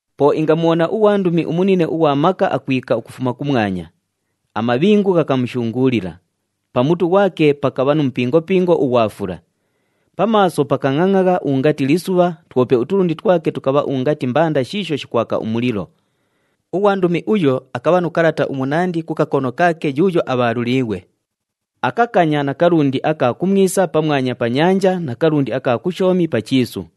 Po ingamubhona ughwandumi umunine ughwa maka akwika ukufuma kumwanya. Amabhingu ghakamushunguulila, pa mutu ghwake pakabha nu mupingopingo ughwa fula. Pa maaso pakangʼangʼagha ungati lisubha, twope utulundi twake tukabha ungati mbanda shiisho shikwaka umulilo. Ughwandumi uyo akabha nu kalata umunandi ku kakono kaake yuuyo abhaaluliighwe. Akakanya na kalundi aka kumwisa pamwanya pa nyanja na kalundi aka kushoomi pa chiisu.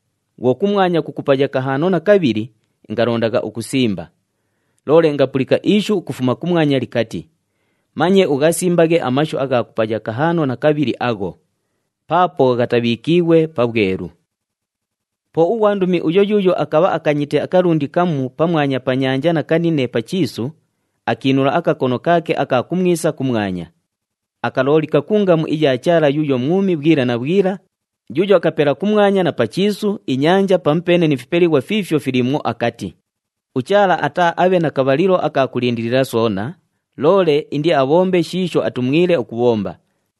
Bhwo kumwanya kukupaya kahaano na kabhili, ingalondagha ukusimba. Loole ingapulika ishu ukufuma kumwanya likati, “Manye ughasimbaghe amashu agha kupaya kahaano na kabhili agho! Paapo ghatabhiikiighwe pabhwelu.” Po ughwandumi uyo yuuyo akabha akanyite akalundi kamu pamwanya pa nyanja na kanine pa chiisu, akiinula akakono kaake aka kumwisa kumwanya. Akaloolika ku ngamu iya Chaala yuuyo mwumi bhwila na bhwila, yuuyo akapela kumwanya na pa chiisu, inyanja pamupeene ni fipelighwa fiifyo filiimwo akati, “UChaala ataaabhe na kabhalilo aka kulindilila soona, loole indiabhombe shiisho atumwile ukubhomba.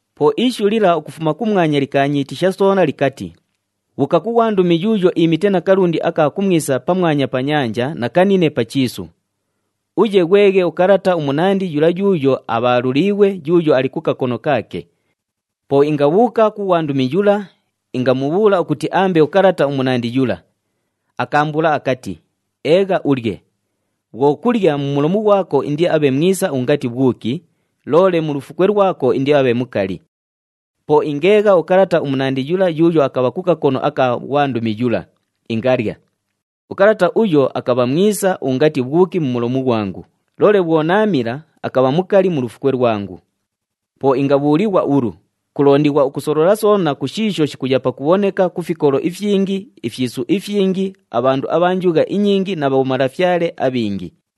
Po ishu lila ukufuma kumwanya likaanyiitisha soona likati, “Bhuuka ku ghwandumi yuuyo iimite na kalundi aka kumwisa pamwanya pa nyanja na kanine pa chiisu. Uye ghweghe ukalata umunandi yula yuuyo abhaaluliighwe, yuuyo ali ku kakono kaake.” Po ingabhuuka ku ghwandumi yula, ingamubhuula ukuti aambe ukalata umunandi yula. Akaambuula akati, “Eegha ulye. Bhwo kulya, mu mulomu ghwako indiabhe mwisa ungati bhwuki, loole mu lufukwe lwako indiabhe mukali.” Po ingeegha ukalata umunandi yula yuuyo akabha ku kakono aka ghwandumi yula, ingalya. Ukalata uyo, akabha mwisa ungati bhwuki mu mulomu ghwangu, loole bhwo naamila, akabha mukali mu lufukwe lwangu. Po ingabhuulighwa ulu, “Kulondighwa ukusolola soona ku shiisho shikuya pakubhoneka ku fikolo ifyingi, ifyisu ifyingi, abhandu abha njugha inyingi na bhomalafyale abhingi.”